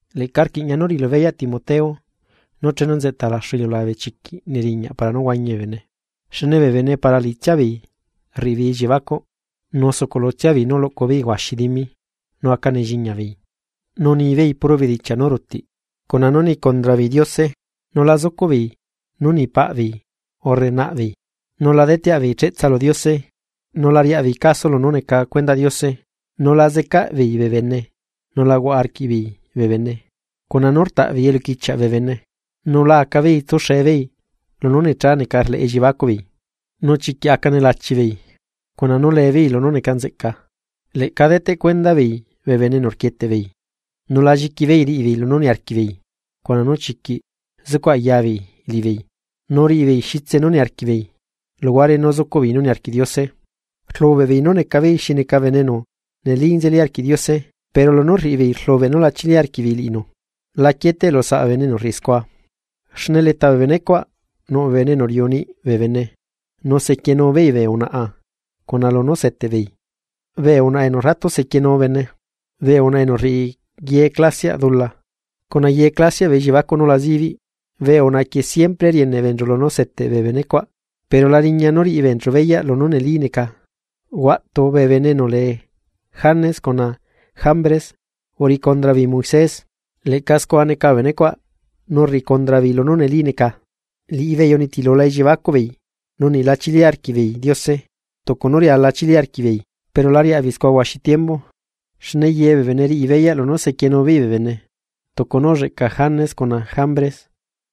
Leꞌca rquiꞌña nú riꞌilu beyaꞌ Timoteo, nú chenu nzeꞌta laxu iliulabe chiquiꞌ neriñaꞌ para nú huañi bee bene. Xne bee bene para liꞌitsia beei rriꞌi beei elliebacuꞌ, nu sucuꞌlutsia beei nú luꞌcu beei huaxi dimi, nu aca nelliña beei, nu nibeei puro bedichiaꞌ nú rutiꞌ, cuna nú ni condra beei Diose, nu la zucuꞌ beei nú ni paꞌ beei urre naꞌ beei, nu la deteaꞌ beei cheꞌtsa lu Diose, nu la riaꞌ beei caso lunú neca cuendaꞌ Diose, nu la zecaꞌ beei bee bene nu la huaꞌa arquiꞌbeei bee bene, cuna nú rtaꞌ beei eluquichiaꞌ bee bene, nu la aca beei tsuxe beei lunú necha neca rleꞌ elliebacuꞌ beei, nu chiquiꞌ aca nelachi beei, cuna nú le beei lunú neca nzeꞌca. Leꞌca deteꞌ cuenda beei bee bene enu rquieteꞌ beei, nu la lliqui beei riꞌi beei lunú niarquiꞌ beei cuna nú chiquiꞌ zucuꞌ aya beei liꞌibeei nu riꞌi beei xitse nú niarquiꞌbeei luhuare nú zucuꞌ beei nú niarquiꞌ Diose. Rlubeꞌ beei nú neca beei xi neca bene enu neli nzeli arquiꞌ Diose, pero lunú rriꞌi beei rlubeꞌ nú la chili arquiꞌbeei liꞌinu. La quieteꞌlu saꞌ bee bene enu rriꞌi scua. Xne leta bee benecuaꞌ nuꞌ bee bene enu riuꞌu niꞌi bee bene nu sequienu beei bee unaꞌa cuna lunú seteꞌ beei bee unaꞌa enu ratu sequienu bene, bee unaꞌa enu rriꞌi ye clasiaꞌ dula cuna ye clasiaꞌ bee elliebacuꞌ nú la zibiꞌ. Bee unaꞌa quieꞌ siempre rieneꞌ beenchu lunú seteꞌ bee bene cuaꞌ, pero la riña nú riꞌi beenchu beyaꞌ lunú neli neca. Huaꞌtu bee bene enu lee Janes cuna Jambres uriꞌi condra beei Moisés. Leꞌca scua neca bee benecuaꞌ nú rriꞌi condra beei lunú neli neca, liꞌibeei unitilula elliebacuꞌ beei nu niꞌla chili arquiꞌbeei Diose tucu nú riala chili arquiꞌbeei. Pero la riaꞌbeei scua huaxi tiembu, xne ye bee bene riꞌi beyaꞌ lunú sequienu beei bee bene, tucu nú ulleꞌca Janes cuna Jambres.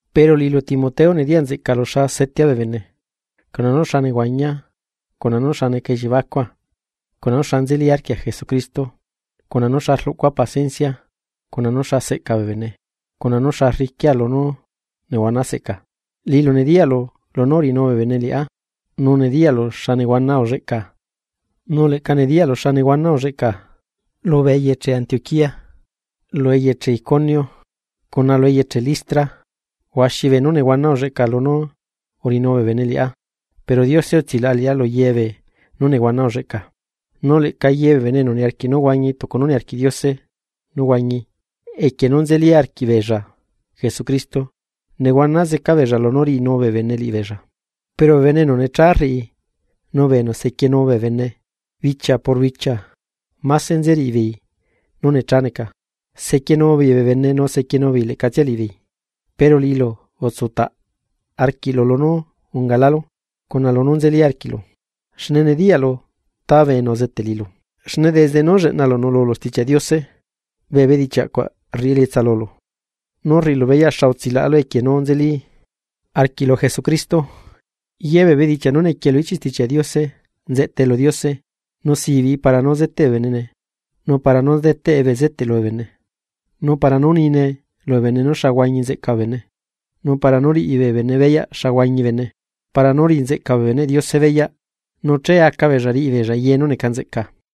Pero liꞌilu Timoteo nediyaꞌ nzeꞌcaꞌlu xa setea bee bene, cuna nú xa nehuañia, cuna nú xa neca ellibacua, cuna nu xa nzeli arquia Jesucristo, cuna nú xa rluꞌcua paciencia, cuna nu xa seꞌca bee bene, cuna nu xa rriquia lunú nehuana seꞌca. Liꞌilu nediyaꞌlu lunú uriꞌinu bee bene liꞌá, nu nediyaꞌlu xa nehuana ulleꞌca nu leꞌca nediyaꞌlu xa nehuana ulleꞌca lubee eyeche Antioquía lu eyeche Iconio cuna lu eyeche Listra. Huaxi beenú nehuana ulleꞌca lunú uriꞌinu bee bene liꞌá, pero Diose utsilaꞌa liꞌá lu ye beenú nehuana ulleꞌca. Nu leꞌca ye bee bene enu niarquiꞌ nú huañi tucu nú niarquiꞌ Diose nú huañi equie nú nzeli arquiꞌbeella Jesucristo, nu nehuana zeca beella lunú riꞌinu bee bene liꞌibeella, pero bee bene enu necha rriꞌi nu bee enu sequienu bee bene bichia por bichia máse nzeriꞌi beei nú necha neca, sequienu beei bee bene nu sequienu beei leꞌcatsia liꞌibeei. Pero liꞌilu utsutaꞌla arquiꞌlu lunú ungalálu, cuna lunú nzeli arquiꞌlu, xne nediyaꞌlu ta bee enu uzeteꞌ liꞌilu. Xne desde nú lleꞌnalu nuꞌlulu Stichiaꞌ Diose, bee bedichiaꞌ cuaꞌ rriꞌi elietsa lulu nú rriꞌilu beyaꞌ xa utsilaꞌalu equie nú nzeli arquiꞌlu Jesucristo. Ye bee bedichiaꞌ nú nequie lu ichiꞌ Stichiaꞌ Diose nzeꞌtae lu Diose. Nu sibiꞌi para nú zeteꞌe bee bene, nu para nú deteꞌe bezeteꞌ lubee bene, nu para nú nine lubee bene nú xa huañi nzeꞌca bene nu para nú riꞌi bee bene beyaꞌ xa huañi bene, para nú riꞌi nzeꞌca bee beneꞌ Diose beyaꞌ, nu che aca beella riꞌi beella ye nú neca nzeꞌca.